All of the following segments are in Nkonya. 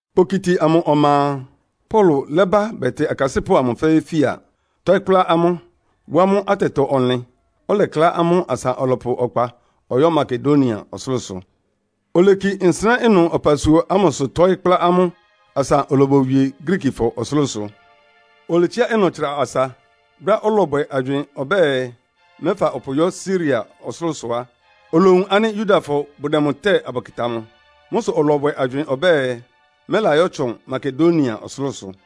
Kpokiti amʋ ɔma a, Paulo lɛ́ba bɛtɩ akasɩ́pʋ́ amʋ fɛ́ɛ́ fía, tɔ́ɩ́ kplá amʋ́, wá amʋ́ atɛtɔ-ɔnlɩn. Ɔlɛklá amʋ́ asa ɔlɔpʋ ɔkpa ɔyɔ́ Makedonia ɔsʋlʋ́sʋ. Oleki nsɩnɛ́ ɩnʋ ɔpasua ámʋsʋ tɔ́ɩ́ kplá amʋ́ asa olobowie Griikifɔ ɔsʋlʋ́sʋ. Oletsiá ɩnʋ tsra asa. Brɛ́á ɔlɔbwɛ agywɩɩn ɔbɛ́ɛ, mɛ́fa ɔpʋ yɔ́ Siria ɔsʋlʋ́sʋ á, olowun ánɩ́ Yudafɔ bʋdɛ mʋ tɛ́ɛ abʋkɩta mʋ. Mʋ́ sʋ ɔlɔbwɛ agywɩɩn ɔbɛ́ɛ mɛ́layɔ́tsʋn Makedonia ɔsʋlʋ́sʋ.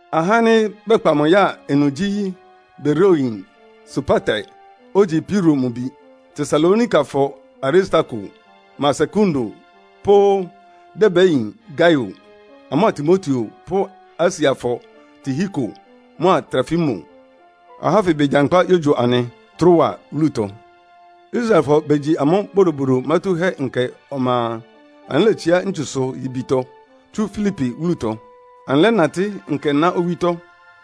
Ahá ánɩ́ bɛkpa mʋ ya ɩnʋ gyí Beroiayin Sopater, ogyi Piro mʋ bi; Tesalonikafɔ Aristarko mʋa Sekundo pʋ́ Derbeyin Gaio; amʋ́a Timoteo pʋ́ Asiafɔ Tihiko mʋa Trofimo. Alɩ ahá ánfɩ begyankpá yógyo anɩ Troa wúlutɔ. Israelfɔ begyi amʋ́ Bodobodo Mátúhɛ́Nkɛ ɔma a, anɩlétsiá ntsusʋ-yibitɔ tsú Filipi wúlutɔ. Anɩlɛ́natɩ́ nkɛná owítɔ́.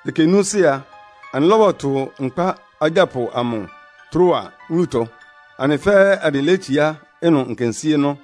Ɛkɛ núúsɩ́ a, anɩlɔ́bɔtʋ nkpá agyápʋ amʋ Troa wúlutɔ. Anɩ fɛ́ɛ́ anɩlétsiá ɩnʋ nkensíénɔ́.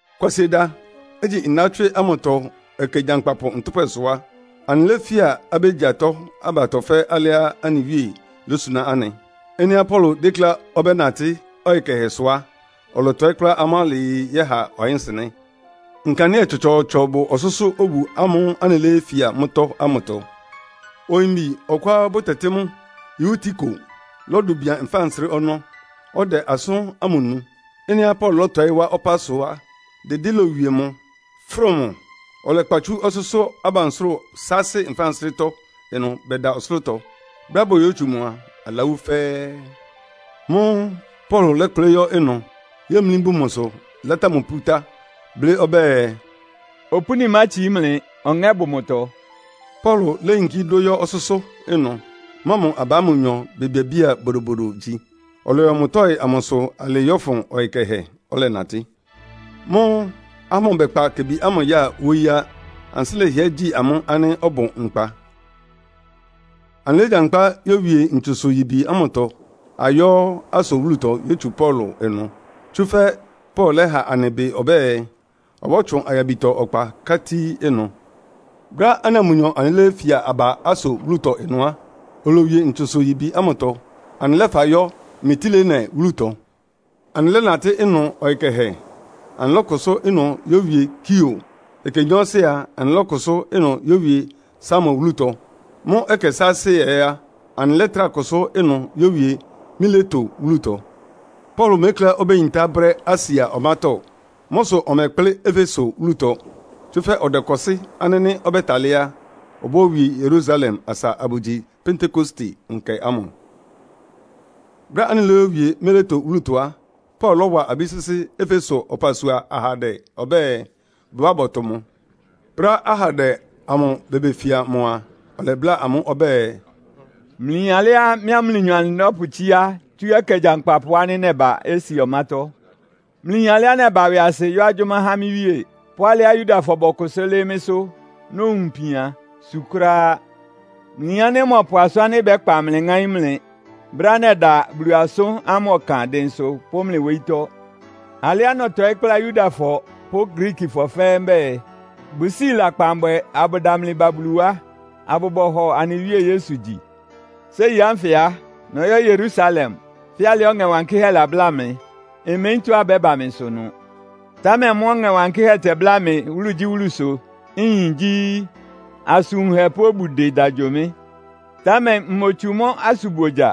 Kwasieda, igyi ndawɔ́tswɩ́ ámʋtɔ ɛkɛ gyankpapʋ ntʋ́pwɛsʋ á, anɩléfía abégyi atɔ́ abatɔ fɛ́ alɩá anɩ Wíe lósuná anɩ. Ɩ́nɩá Paulo dékléá ɔbɛ́natɩ́ ɔyɩ kɛhɛ sʋ á, ɔlɔtɔɩ́ kplá amʋ́ alɩɩ yɛ́ha ɔyɩ́nsɩnɛ́. Nkandɩ́ɛ tsɔtsɔɔtsɔ bʋ ɔsʋ́sʋ́ obu ámʋ́ʋ́ anɩléfía mʋ́tɔ́ ámʋtɔ. Oyimbi ɔkʋá bʋtɛtɩ́ mʋ Eutiko lɔ́dʋ bian nfánsrɩ́ ɔnɔ́, ɔdɛ asʋ́n ámʋ nu. Ɩ́nɩá Paulo lɔ́tɔɩ́ wá ɔpá sʋ á, dɩdɩ́ lowie mʋ, fʋ́rʋ mʋ. Ɔlɛkpa tsú ɔsʋ́sʋ́ abansʋ́rʋ saasɩ nfánsrɩ́tɔ́ ɩnʋ bɛda ɔsʋlʋ́tɔ. Brɛ́á boyótsu mʋ a, alawú fɛ́ɛ́. Mʋ́ʋ́ Paulo lɛ́kplɩ́ yɔ́ ɩnʋ, yémlí bun mʋsʋ, látá mʋ pútá, blɩ́ ɔbɛ́ɛ, “Opúni mátsií mlɩ, ɔŋɛ́ bʋ mʋtɔ.” Paulo léyinkí dʋ́ yɔ́ ɔsʋ́sʋ́ ɩnʋ, mʋa mʋ aba ámʋ nyɔ bebiabía bodobodo gyi. Ɔlɔyɔ mʋ tɔ́ɩ amʋsʋ alɩɩ yɔ́fʋn ɔyɩ kɛhɛ, ɔlɛnatɩ́. Mʋ́ʋ́ ahá ámʋ bɛ́kpa kebi ámʋ ya wóyí á. Ansɩ́ lɛhɩɛ gyi amʋ́ ánɩ́ ɔbʋ nkpa. Anɩlégyankpá yówie ntsusʋ-yibi ámʋtɔ ayɔ́ Aso wúlutɔ yótsu Paulo ɩnʋ. Tsúfɛ́ Paulo lɛ́ha anɩ ɩbɩ ɔbɛ́ɛ, ɔbɔ́tsʋn ayabitɔ ɔkpa ká tíí ɩnʋ. Brɛ́á anɩa mʋnyɔ anɩléyéfia aba Aso wúlutɔ ɩnʋ á, olowie ntsusʋ-yibi ámʋtɔ, anɩlɛ́fa yɔ́ Mitilene wúlutɔ. Anɩlɛ́natɩ́ ɩnʋ ɔyɩ kɛhɛ, anɩlɔ́kʋsʋ́ ɩnʋ yówie Kio. Ɛkɛ nyɔɔsɩ a, anɩlɔ́kʋsʋ́ ɩnʋ yówie Samo wúlutɔ. Mʋ́ ɛkɛ sáásɩ́ ɛ́ á, anɩlɛ́trá kʋsʋ́ ɩnʋ yówie Mileto wúlutɔ. Paulo mékléá obéyintá brɛ́ Asia ɔmátɔ́. Mʋ́ sʋ ɔmɛkplɩ́ Efeso wúlutɔ, tsúfɛ́ ɔdɛkɔsɩ́ ánɩ́ nɩ́ ɔbɛ́talɩ́ á, obóyówie Yerusalem asa abʋgyi Pentekoste nkɛ ámʋ. Brɛ́á anɩlóyowie Mileto wúlutɔ á, Paulo lɔ́wa abí sɩ́sɩ́ Efeso ɔpasua ahandɛ ɔbɛ́ɛ, bʋbá bɔtʋ mʋ. Brɛ́á ahandɛ amʋ bebefia mʋ a, ɔlɛbláa amʋ́ ɔbɛ́ɛ, “Mlɩyin alɩá mɩ́a mlɩnyɔ anɩlɔ́pʋtsíá tsú ɛkɛ gyankpapʋ ánɩ́ nɛba Asia ɔmátɔ́. Mlɩyin alɩá nɛba ɩwɩasɩ yɔ́ agyʋ́má há mɩ́ Wíe, pʋ́ alɩá Yudafɔ bɔkʋsʋ́ lɩ́ɩ́ mɩ́sʋ́, nowun ipian, su kʋ́ráá. Mlɩyin ánɩ́ mmɔpʋ asʋ́n ánɩ́ ɩbɛ́kpa mlɩ ŋáín mlɩ brɛ́á nɛda Bulu asʋ́n ámʋ ɔkan dɩnsʋ pʋ́ mlɩ wóyítɔ́. Alɩá nɔtɔɩ́ kplá Yudafɔ pʋ́ Griikifɔ fɛ́ɛ́ mbɛ́ɛ, bʋsíi lakpan bwɛ abʋdamli ba Bulu wá, abʋbɔhɔ anɩ Wíe Yesu gyi. “Séi ánfɩ á, nɔyɔ́ Yerusalem, fɛ́ alɩá Ɔŋɛ Wankɩ́hɛ́ labláa mɩ. Mmeyín tɔ́á ɩbɛ́ba mɩsʋ ɩnʋ. Támɛ mʋ́á Ɔŋɛ Wankɩ́hɛ́ tɛbláa mɩ́ wúlugyíwúlusʋ, nyin gyí, asʋn wunhɛ pʋ́ obudɩ da gyo mɩ́. Támɛ mmotsu mʋ́ asʋnbogya.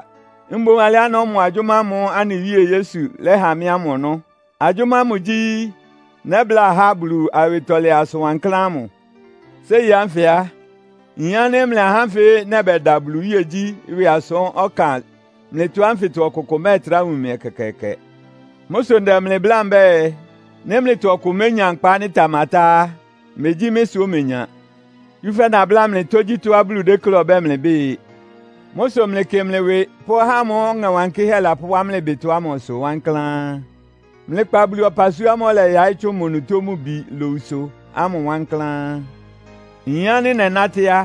Mboún alɩá nɔ́mɔ agyʋ́má ámʋ́ʋ́ anɩ Wíe Yesu lɛ́ha mɩ́ ámʋ ɔnɔ́. Agyʋ́má ámʋ gyí, nɛ́bláa ahá Bulu awɩtɔlɛ asʋn wankláán ámʋ. “Séi ánfɩ a, nyin ánɩ́ mlɩ ahá ánfɩ nɛbɛda Bulu iwíegyí ɩwɩ asʋ́n ɔkan mlɩtɔ ánfɩtɔ ɔkʋkʋ mɛ́ɛtrá wun mɩ ɛkɛkɛɛkɛ. Mʋ́ sʋ ndɛ mlɩ bláa mbɛ́ɛ, nɩ́ mlɩtɔ ɔkʋ ménya nkpa ánɩ́ ɩtamatá á, megyí mɩ́ sʋ omenya. Tsúfɛ́ nabláa mlɩ tógyítɔ́á Bulu déklé ɔbɛ́ɛ mlɩbɩ́ɩ. “Mʋ́ sʋ mlɩkɩ mlɩ ɩwɩ pʋ́ ahá ámʋ́ʋ́ Ɔŋɛ Wankɩ́hɛ́ lɔ́pʋwá mlɩ ɩbɩtɔ ámʋsʋ wankláán. Mlɩkpa Bulu ɔpasua ámʋ́ʋ́ ɔlɛyaɩ́ tsʋn mʋ onutó mʋ bi lowusʋ ámʋ wankláán. Nyin ánɩ́ nɛnátɩ́ á,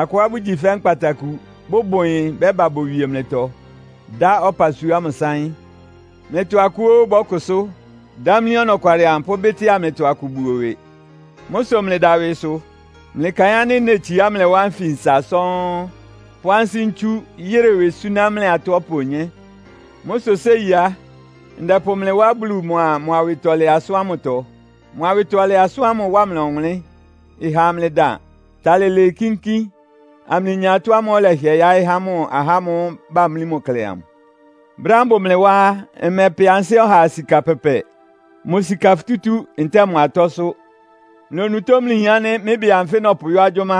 akʋá bʋgyi fɛ́ nkpataku, bʋbʋ ɩyɩn bɛ́ba bowie mlɩtɔ, dá ɔpasua ámʋ sáɩ́n. Mlɩtɔ akʋ óó bɔ́kʋsʋ́, dámlí ɔnɔkwalɩ amʋ pʋ́bɩ́tɩ́a mlɩtɔ akʋ buo ɩwɩ. Mʋ́ sʋ mlɩda ɩwɩsʋ. Mlɩkaɩn ánɩ́ netsiá mlɩ wá nfinsa sɔ́ɔ́n, pʋ́ ansɩ́ ntsú yɩ́rɩ ɩwɩ súná mlɩ atɔ́ ɔpa onyé. “Mʋ́ sʋ séi á, ndɛpʋ mlɩ wá Bulu mʋa mʋ awɩtɔlɛ asʋ́n ámʋtɔ. Mʋ awɩtɔlɛ asʋ́n ámʋ ɩwá mlɩ ɔwʋnlɩ́n, ɩha amlɩdan, talɩ lɩɩ kínkín, amlɩnya atɔ́ ámʋ́ʋ́ ɔlɛhɩɛ yáɩ́ há mʋ ahá ámʋ́ʋ́ bamlí mʋ klɛ amʋ. Brɛ́á mbʋ mlɩ wá á, mmɛpɛ ansɩ́ ɔhaa sika pɛpɛ, mʋ sika futútú ntɛ́ɛ mʋ atɔ́sʋ́. Mlɩ onutó mlɩyin ánɩ́ mɩ́ ɩbɩ anfɩ nɔpʋyɔ́ agyʋ́má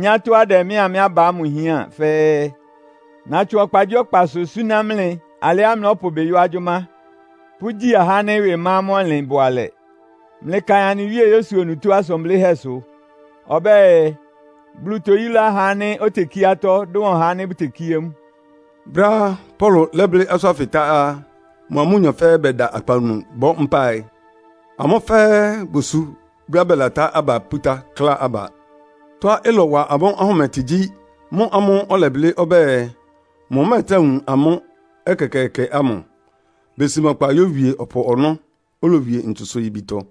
nyá tɔ́á ɩdɛ mɩ́a mɩ́ aba ámʋ hián fɛ́ɛ́. Natsʋn ɔkpagyíɔkpasʋ súná mlɩ alɩá mlɔ́pʋ ɩbɩ yɔ́ agyʋ́má, pʋ́gyi ahá ánɩ́ ɩwɩ ma amʋ́ ɔnlɩn bʋalɛ. Mlɩkaɩn anɩ Wíe Yesu onutó asʋn blɩ́hɛ́sʋ. Ɔbɛ́ɛ, ‘Bulu toyúlá ɔhá ánɩ́ otekíé atɔ́ dʋn ɔhá ánɩ́ bʋtekíé mʋ.’” Brɛ́á Paulo lɛ́blɩ́ asʋ́n ánfɩ tá á, mʋa amʋ́nyɔ fɛ́ɛ́ bɛda akpawunu bɔ́ mpáɩ. Amʋ́ fɛ́ɛ́ bosu brɛ́á bɛlatá aba pútá, klá aba. Tɔ́á ɩlɔwa amʋ́ ahʋmɩtɩ gyí mʋ́ ámʋ́ʋ́ ɔlɛblɩ́ ɔbɛ́ɛ, mʋmɛ́ɛtrá wun amʋ́ ɛkɛkɛɛkɛ ámʋ. Besi mʋ ɔkpa yówie ɔpʋ ɔnɔ́, olowie ntsusʋ-yibitɔ.